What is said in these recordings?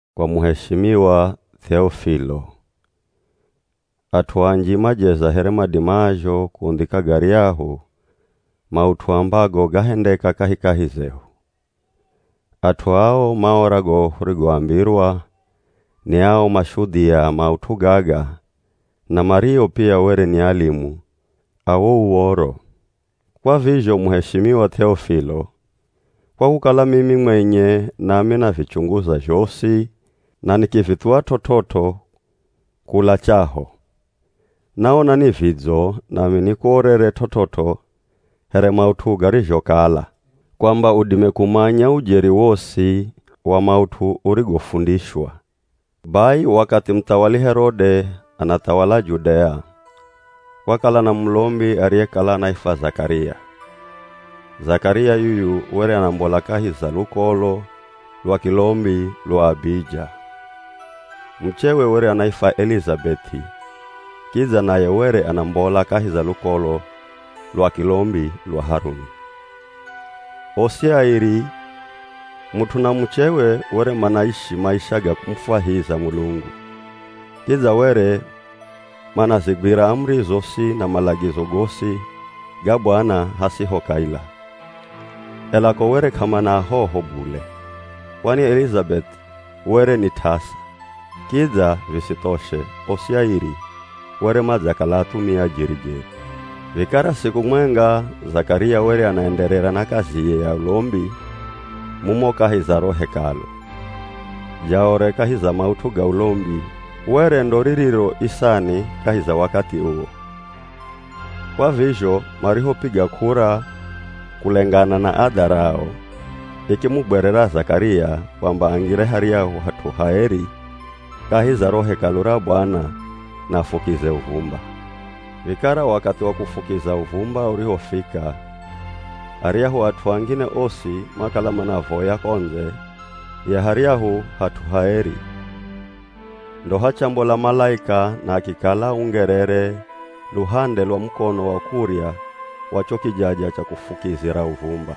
Kwa muheshimiwa Th'eofilo. At'u anji majeza here madimazho kundhika garyahu maut'u ambago gahendeka kahikahi zehu. At'u ao maora go hurigoambirwa ni ao mashudhia a maut'u gaga na mario pia were ni alimu a wo Uv̱oro. Kwa vizho muheshimiwa Th'eofilo, kwa kukala mimi mwenye nami navichunguza zhosi na nikivithuwa t'ot'ot'o kula chaho, naona ni vidzo nami nikuorere t'ot'ot'o here maut'u garizhokala, kwamba udime kumanya ujeri wosi wa maut'u urigofundishwa. Bai wakathi muthawali Herode anathawala Judea, kwakala na mulombi ariyekala anaifwa Zakaria. Zakaria yuyu were anambola kahi za lukolo lwa kilombi lwa Abija. Muchewe were anaifwa Elizabeth'i kidza naye were anambola kahi za lukolo lwa kilombi lwa Haruni. Osi airi, mut'u na muchewe were manaishi maisha ga kumufwahiza Mulungu, kidza were manazigwira amuri zosi na malagizo gosi ga Bwana hasiho kaila. Ela ko were k'amana ahoho bule, kwani Elizabeth'i were ni t'asa, kidza visithoshe, osi airi were madzakala athumia jeri-jeri. Vikara siku mwenga Zakaria were anaenderera na kaziye ya ulombi mumo kahi za ro Hekalu. Jaore kahi za maut'u ga ulombi were ndo ririro isani kahi za wakathi uwo, Kwa vizho marihopiga k'ura kulengana na adha rao, ikimugwerera Zakaria kwamba angire haryahu hat'u haeri kahi za ro Hekalu ra Bwana na afukize uvumba. Vikara wakathi wa kufukiza uvumba urihofika, aryahu at'u angine osi makala manavoya ko ndze ya haryahu hat'u haeri. Ndo hachambola malaika na akikala aungerere luhande lwa mukono wa kurya wa cho kijaja cha kufukizira uvumba.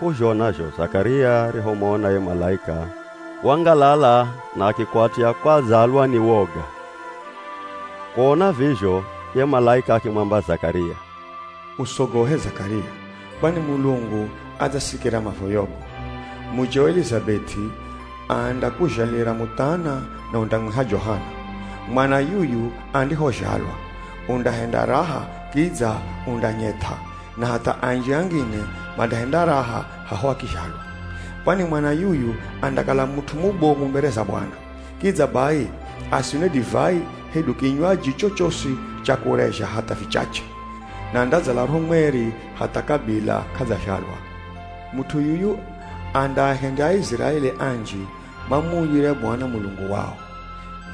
K'uzhona zho Zakaria arihomona ye malaika wangalala na akikwatya kwadzalwa ni woga. Kuona vizho, ye malaika akimwamba Zakaria, “Usogohe Zakaria! Kwani Mulungu adzasikira mavoyogo. Mucheo Elizabeth'i andakuzhalira muthana na undamwiha Johana. Mwana yuyu andihozhalwa undahenda raha kidza undanyeth'a, na hatha anji angine mandahenda raha haho akizhalwa. Kwani mwana yuyu andakala mut'u mubomu mbere za Bwana, kidza bai asinwe divai hedu kinywaji chochosi cha kurezha hatha vichache, na andadzala Roho Mweri hatha kabila k'adzazhalwa. Mut'u yuyu andaahendya Aiziraeli anji mamuuyire Bwana Mulungu wao.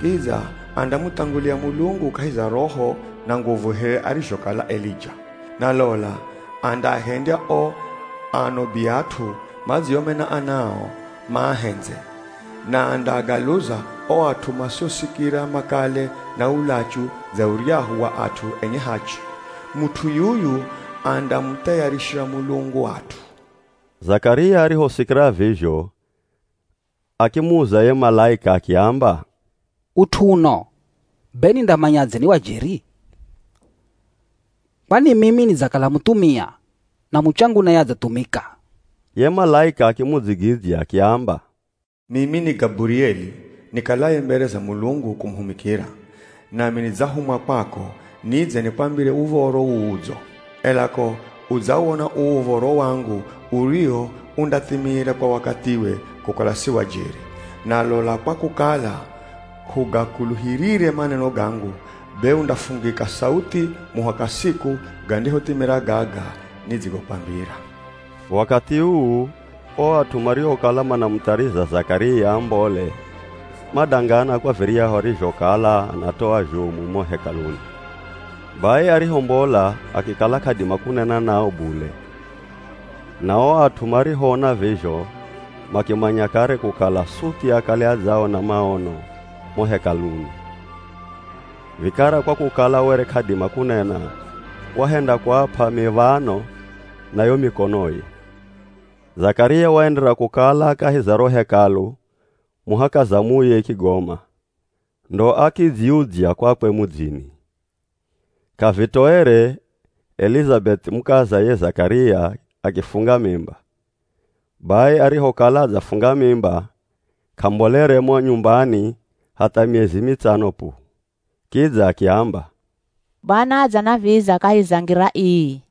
Kidza andamuthangulia Mulungu kahi za roho na nguvu here arizhokala Elija. Na lola andaahendya o ano biat'u madziomena ana ao, maahendze, na andaagaluza o at'u masiosikira makale na ulachu dza uryahu wa at'u enye hachi. Mut'u yuyu andamuthayarishira Mulungu at'u.” Zakaria arihosikira vizho, akimuza ye malaika akiamba, “Ut'u uno be nindamanyadze ni wa jeri? Kwani mimi nidzakala muthumia na muchangu naye adzathumika.” Ye malaika akimudzigidzya akiamba, “Mimi ni Gaburieli, nikalaye mbere za Mulungu kumuhumikira, nami nidzahumwa kwako nidze nikwambire uv̱oro uu udzo. Ela ko udzawona uu uv̱oro wangu uriwo undathimira kwa wakathiwe kukala si wa jeri, na lola kwa kukala k'ugakuluhirire maneno gangu, be undafungika sauthi muhaka siku gandihothimira gaga nidzigokwambira.” Wakathi uu o at'u mariokala manamuthariza Zakaria ambole madangana kwa viryahu arizhokala anatoa zhomu mo Hekaluni. Bai arihombola akikala k'adima kunena nao bule, na o at'u marihoona vizho makimanya kare kukala suthi akale adzaona maono mo Hekaluni. Vikara kwa kukala were k'adima kunena wahenda kuap'a miv̱ano na yo mikonoye. Zakaria waenderera kukala kahi za ro Hekalu muhaka zamuye ikigoma ndo akidziudzya kwakwe mudzini. K'avitoere Elizabeth'i mukaza ye Zakaria akifunga mimba. Bai arihokala adzafunga mimba k'ambolere mo nyumbani hatha miezi mitsano pu. Kidza akiamba, “Bwana adzanaviza kahi za ngira ii.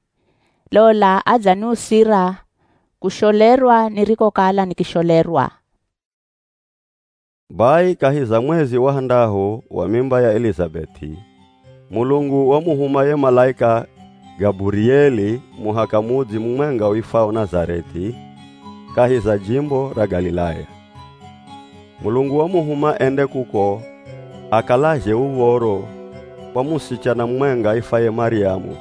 Lola adzaniusira kusholerwa nirikokala nikisholerwa!” Bai kahi za mwezi wa handahu wa mimba ya Elizabeth'i, Mulungu wamuhuma ye malaika Gaburieli muhaka mudzi mumwenga uifwao Nazareth'i kahi za jimbo ra Galilaya. Mulungu wamuhuma ende kuko akalazhe uv̱oro kwa musichana mumwenga aifwaye Maryamu.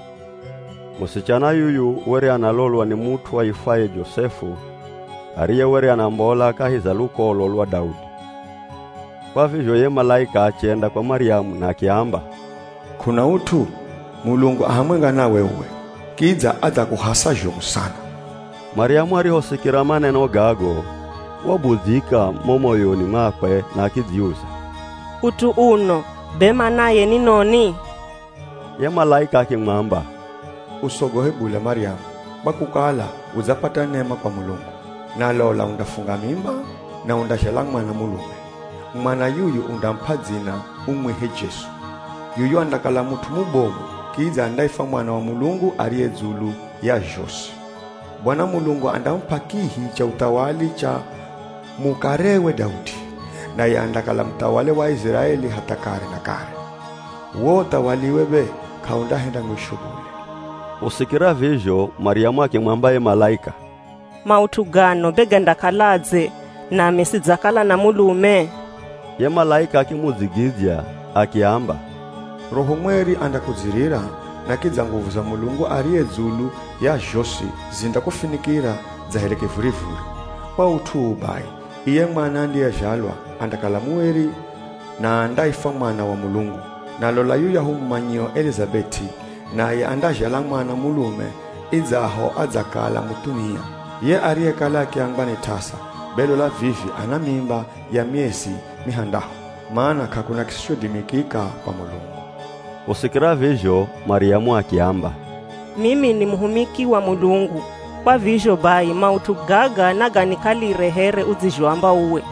Musichana yuyu were analolwa ni mut'u aifwaye Josefu, ariye were anambola kahi za lukolo lwa Daudi. Kwa vizho ye malaika achenda kwa Maryamu na akiamba, “K'una ut'u? Mulungu a hamwenga nawe uwe, kidza adzakuhasa zhomu sana!” Maryamu arihosikira maneno gago, wabudzyika mo moyoni mwakwe na akidziuza, “Ut'u uno be manaye ni noni?” Ye malaika akimwamba, “Usogohe bule Maryamu, kwa kukala udzapata nema kwa Mulungu. Na lola undafunga mimba na undazhala mwana mulume. Mwana yuyu undamup'a dzina umwihe Jesu. Yuyu andakala mut'u mubomu kidza andaifwa Mwana wa Mulungu ariye dzulu ya zhosi. Bwana Mulungu andamup'a kihi cha uthawali cha mukarewe Daudi. Naye andakala muthawali wa Aiziraeli hatha kare na kare. Wo uthawaliwe be k'aundahenda mwisho bule.” Kusikira vizho Maryamu akimwamba ye malaika, “Maut'u gano be gandakaladze, nami sidzakala na mulume?” Ye malaika akimudzigidzya akiamba, “Roho Mweri andakudzirira, na kidza nguvu za Mulungu ariye dzulu ya zhosi zindakufinikira dza here kivurivuri. Kwa ut'u uu bai, iye mwana andiyezhalwa andakala mueri, na andaifwa Mwana wa Mulungu. Na lola yuyahu mumanyio Elizabeth'i naye andazhala mwana mulume idzaho adzakala muthumia. Ye ariyekala akiambwa ni t'asa, be lola vivi ana mimba ya miezi mihandahu, mana k'akuna kisichodimikika kwa Mulungu.” Kusikira vizho Maryamu akiamba, “Mimi ni muhumiki wa Mulungu, kwa vizho bai maut'u gaga naganikalire here udzizhoamba uwe.”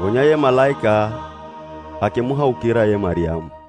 Gonya ye malaika akimuhaukira ye Maryamu.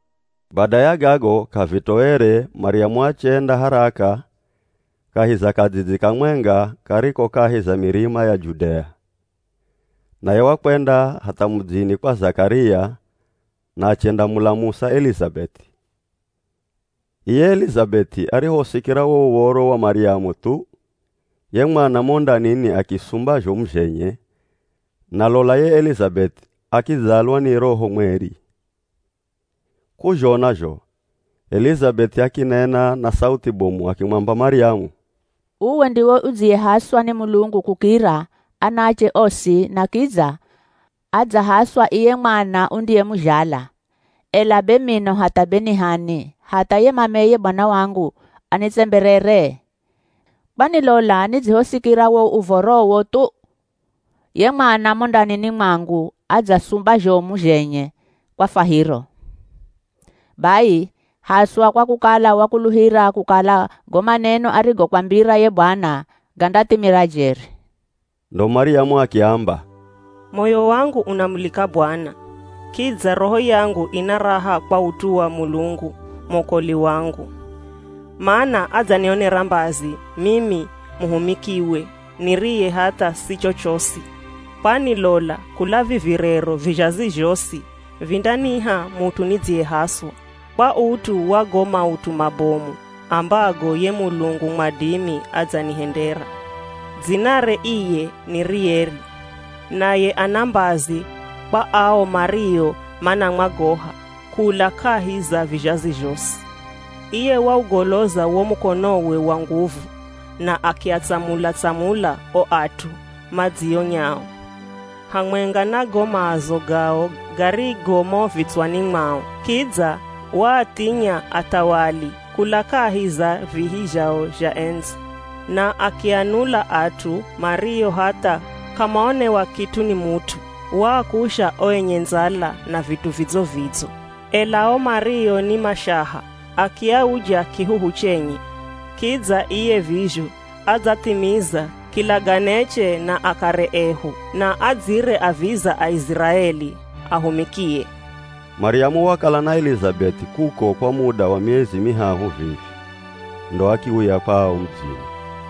Bada ya gago, k'avitoere Maryamu achenda haraka kahi za kadzidzi kamwenga kariko kahi za mirima ya Judea. Naye wakwenda hatha mudzini kwa Zakaria na achendamulamusa Elizabeth'i. Iye Elizabeth'i arihosikira wo uvoro wa Maryamu thu, ye mwana mo ndanini akisumba zhomu zhenye na lola ye Elizabeth'i akidzalwa ni Roho Mweri. K'uzhona zho Elizabeth'i akinena na sauthi bomu akimwamba Maryamu, “Uwe ndiwe udziyehaswa ni Mulungu kukira anaache osi na kidza adzahaswa iye mwana undiyemuzhala! Ela be mino hatha be ni h'ani hatha ye mameye Bwana wangu anitsemberere? Kwani lola nidzihosikira wo uvorowo thu, ye mwana mo ndanini mwangu adzasumba zhomu zhenye kwa fwahiro. Bai haswa kwa kukala wakuluhira kukala go maneno arigokwambira ye Bwana gandathimira jeri.” Ndo Maryamu akiamba, “Moyo wangu unamulika Bwana. Kidza roho yangu ina raha kwa ut'u wa Mulungu mwokoli wangu, mana adzanionera mbazi mimi muhumikiwe niriye hatha si chochosi! Kwani lola kula vivi rero vizhazi zhosi vindaniha mut'u nidziyehaswa, kwa ut'u wa go maut'u mabomu ambago ye Mulungu mwadimi adzanihendera. Dzinare iye ni rieri. Naye ana mbazi kwa ao mario manamwagoha, kula kahi za vizhazi zhosi. Iye waugoloza wo mukonowe wa nguvu na akiatsamula-tsamula o at'u madzionyao hamwenga na go maazo gao garigo mo vitswani mwao. Kidza waathinya athawali kula kahi za vihi zhao zha endzi, na akianula at'u mario hatha k'amaonewa kit'u ni mut'u. Waakusha o enye ndzala na vit'u vidzo-vidzo, ela o mario ni mashaha akiauja kihuhu chenye. Kidza iye vizho adzathimiza kilaganeche na akare ehu na adzire aviza Aiziraeli, ahumikie.” Maryamu wakala na Elizabeth'i kuko kwa muda wa miezi mihahu vivi, ndo akiuya kwao mudzini.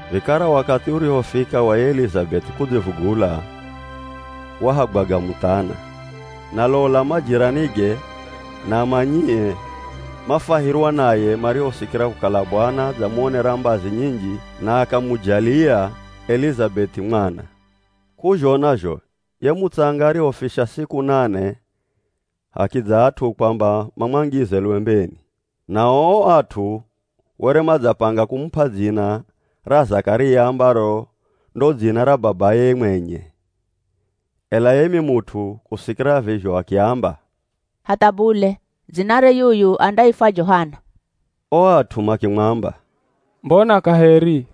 Vikara wakathi urihofika wa ye Elizabeth'i kudzivugula, wahagwaga muthana. Na lola majiranige na amanyie mafwahirwa naye marihosikira kukala Bwana adzamuonera mbazi nyinji na akamujalia Elizabeth'i mwana. K'uzhona zho ye mutsanga arihofisha siku nane hakidza at'u kwamba mamwangize lwembeni, nao o at'u were madzapanga kumup'a dzina ra Zakaria ambaro ndo dzina ra babaye mwenye. Ela ye mimut'u kusikira vizho akiamba, “Hatha bule! Dzinare yuyu andaifwa Johana.” O at'u makimwamba, “Mbona kaheri,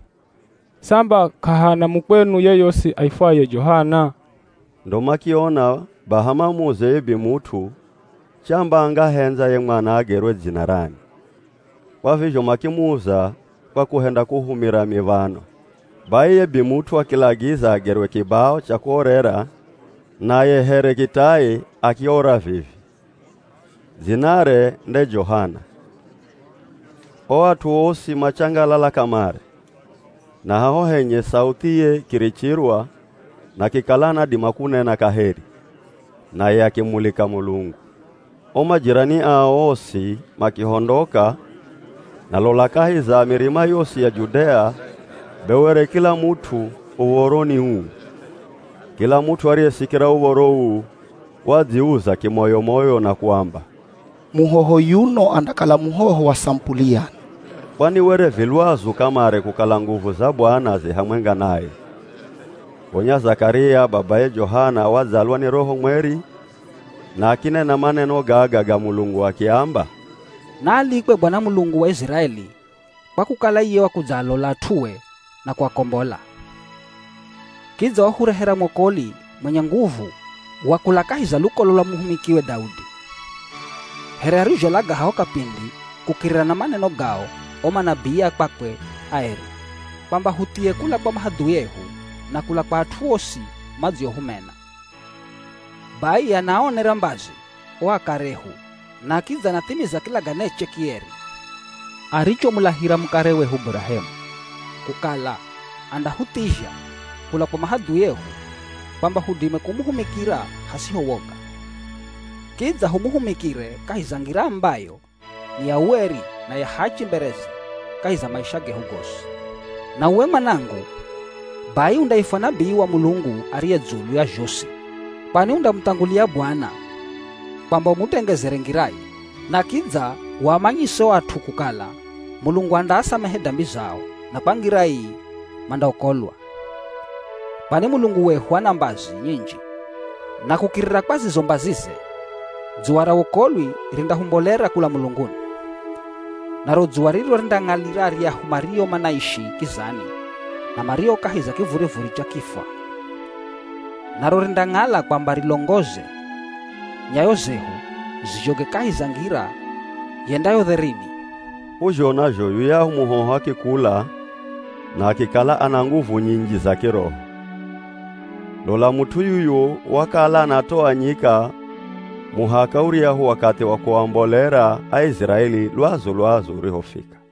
samba k'ahana mukwenu yoyosi aifwaye Johana?” Ndo makiona baha mamuze ye bimut'u chamba angahendza ye mwana agerwe dzina rani. Kwa vizho makimuza kwa kuhenda kuhumira miv̱ano. Bai ye bimut'u akilagiza agerwe kibao cha kuorera, na ye here kitai akiora vivi, “Dzinare nde Johana.” O at'u osi machangalala kamare. Na haho henye sauthiye ikirichirwa na akikala anadima kunena kaheri, naye akimulika Mulungu. O majirani ao osi makihondoka na lola kahi za mirima yosi ya Judea be were kila mut'u uv̱oro ni uu. Kila mut'u ariyesikira uv̱oro uu wadziuza kimoyo-moyo na kuamba, “Muhoho yuno andakala muhoho wa samupuli yani?” Kwani were vi lwazu kamare kukala nguvu za Bwana zi hamwenga naye. Gonya Zakaria, babaye Johana wadzalwa ni Roho Mweri na akinena maneno gaga ga Mulungu akiamba, “Naalikwe Bwana Mulungu wa Iziraeli kwa kukala iye wakudzaalola at'ue na kuakombola. Kidza wahurehera mwokoli mwenye nguvu wa kula kahi za lukolo lwa muhumikiwe Daudi. Here arizholaga haho kapindi kukirira na maneno gao o manabii a kwakwe aeri, kwamba huthie kula kwa mahadhui ehu na kula kwa at'u osi madziohumena. Bai anaaonera mbazi o akare ehu na kidza anathimiza kilaganeche kieri, arichomulahira mukare wehu Burahemu kukala andahuthizha kula kwa mahadhui ehu kwamba hudime kumuhumikira hasiho woga. Kidza humuhumikire kahi za ngira ambayo ni ya ueri na ya hachi mbereze kahi za maisha gehu gosi. “Na uwe mwanangu, bai undaifwa nabii wa Mulungu ariye dzulu ya zhosi kwani undamuthangulia Bwana kwamba umutengezere ngiraye, na kidza uamanyise o at'u kukala Mulungu andaasamehe dambi zao na kwa ngira ii mandaokolwa. Kwani Mulungu wehu ana mbazi nyinji na kukirira kwa zizo mbazize, dzuwa ra wokolwi rindahumbolera kula mulunguni. Naro dzuwa riro rindaang'alira aryahu mario manaishi kizani na mario kahi za kivurivuri cha kifwa. Naro rindang'ala kwamba rilongoze nyayo zehu zizhoge kahi za ngira yendayo dherini.” K'uzhona zho yuyahu muhoho akikula na akikala ana nguvu nyinji za kiroho. Lola mut'u yuyu wakala anatoa nyika muhaka uryahu wakathi wa kuambolera Aiziraeli lwazu-lwazu urihofika.